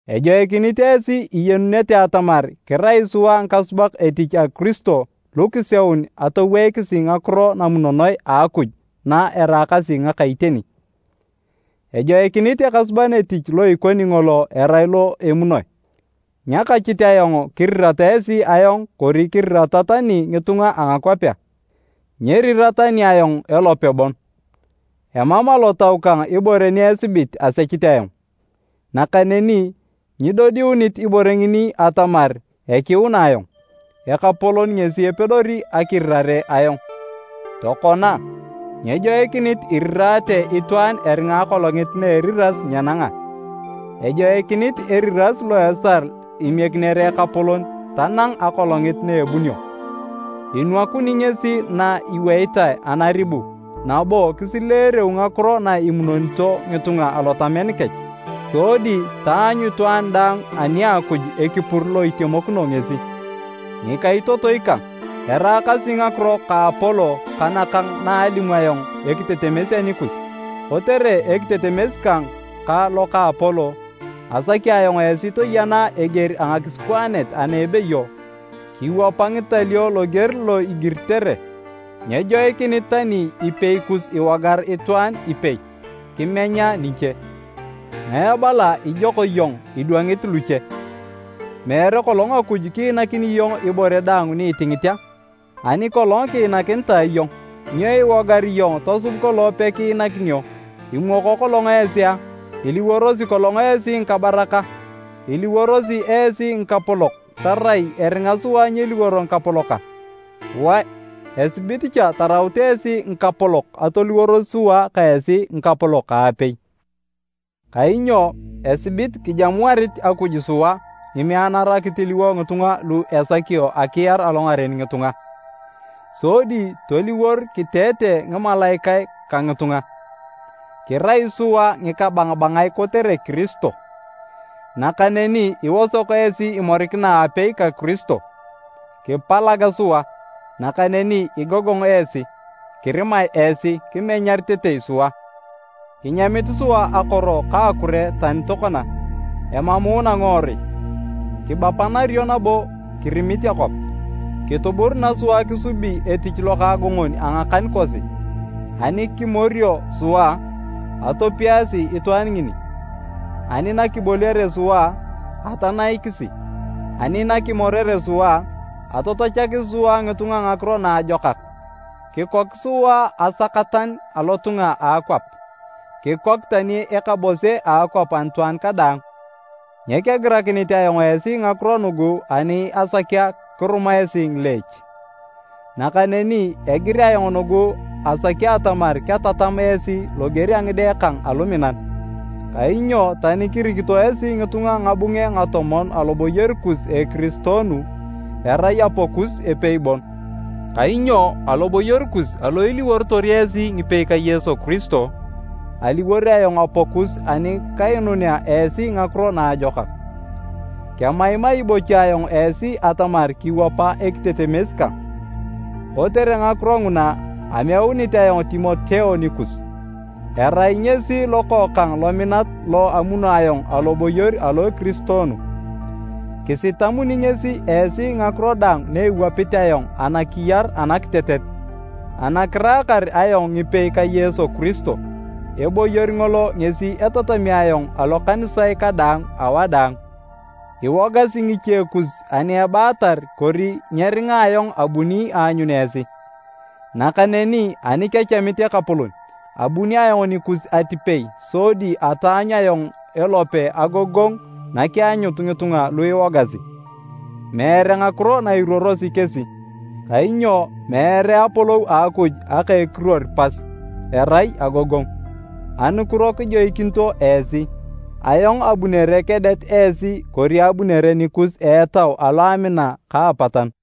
Ejoikinit esi iyenunete atamar kirai sua ngikasubak etich a Kiristo lu kiseun atoweikisi ngakiro namunonoe a Akuj na eraakasi ngaka iteni. Ejoikinit ekasuban etich lo ikoni ngolo erai lo emunoi. Nyakachit ayong kirirata esi ayong kori kerirata tani ngitunga a ngakwapea, nyerira tani ayong elope bon. Emam alotau kang ibore ni esibit asechit ayong, nakaneni nyidodiunit ibore ngini atamar ekiuna ayong. Ekapolon ngesi epedori akirirare ayong. Tokona, nyejoikinit iriraate itwaan eringa Akolongit na eriras nyenanga. Ejoikinit eriras lo esal imiekinere Ekapolon tanang Akolongit na ebunio. Inwakuni ngesi na iweitae anaribu nabo kisileereu ngakiro na imunonito ngitunga alotamen kech. Sodi taanyu itwaan daang ani a Akuj ekipur lo itemokino ngesi. Ngikaitotoi kang, eraakasi ngakiro ka Apolo ka nakang naalimu ayong ekitetemes anikus, kotere ekitetemes kang ka lo ka Apolo, asaki ayong esi toyena eger a ngakisikwaanet ana ebeyo, “Kiwapa ngitalio loger lo igiritere.” Nyejoikinit tani ipei kus iwogar itwaan ipei, kimenya niche. Ngae ebala ijok iyong idwangit luche? Meere kolong Akuj kiinakini iyong ibore daang ni itingit a? Ani kolong kiinakinitae iyong, nyo iwogar iyong tosub kolong pekiinakinio? Imwoko kolong esi a? Iliworosi kolong esi ngikabarak a? Iliworosi esi ngikapolok tarai eringa sua nyeliworo ngikapolok a? Wae, esibit cha taraut esi ngikapolok atoliworos sua ka esi ngikapolok aapei. Kainyo esibit kijamuarit Akuj sua ngimeanara kitiliwo ngitunga lu esakio akiar alongaren ngitunga, sodi toliwor kiteete ngimalaikae ka ngitunga. Kirai sua ngikabangabangae kotere Kiristo, nakaneni iosok esi imorikina aapei ka Kiristo! Kipalag sua, nakaneni igogong esi! Kirimae esi, kimenyaritetei sua. Kinyamit sua akoro ka akure tani tokona, emamuuna ngiworui, kibapanario nabo kirimit akwap. Kituburuna sua kisubi etich lokaagongon a ngakan kosi. Ani kimorio sua, atopiasi itwaan ngini, ani nakiboliare sua, atanaikisi. Ani nakimorere sua, atatachakisi sua ngitunga ngakiro naajokak. Kikok sua asakatan alotunga a akwap, kikok tani ekabose a akwap anitwaan kadaang! Nyekegirakinit ayong esi ngakiro nugu ani asakea kiruma esi ngileech, nakaneni egir ayong nugu asaki atamar ketatam esi loger a ngide kang aluminan. Kainyo tani kirikito esi ngitunga ngabunge ngatomon aloboyor kus a ekiristoonu, erai apakus epei bon, kainyo aloboyor kus alo iliworotor esi ngipei ka Yesu Kiristo, aliwor ayong apakus ani kainunea esi Ngakiro Naajokak. Kemaimai bocha ayong esi atamar kiwapa ekitetemes kang. Kotere ngakiro nguna, ameunit ayong Timoteo nikus. Erai ngesi lokookang lominat lo amuno ayong aloboyor alo ekiristoonu. Kisitamuni ngesi esi ngakiro daang na ewapit ayong anakiyar anakitetet ana kiraakar ayong ngipei ka Yesu Kiristo. Eboyor ngolo ngesi etatami ayong alokanisae kadaang, awadaang. Iwogasi ngiche kus ani ebaatar kori nyeringa ayong abuni aanyun esi. Nakaneni ani kechamit Ekapolon, abuni ayong nikus atipei sodi ataanyu ayong elope agogongu nakeanyut ngitunga lu iwogasi, meere ngakiro na iruorosi kesi. Kainyo meere Apolou a Akuj aka ekiruor pas, erai agogongu. Anukiro kijoikinito esi, ayong abunere kedet esi kori abunere nikus a etau alo a amina ka apatanu.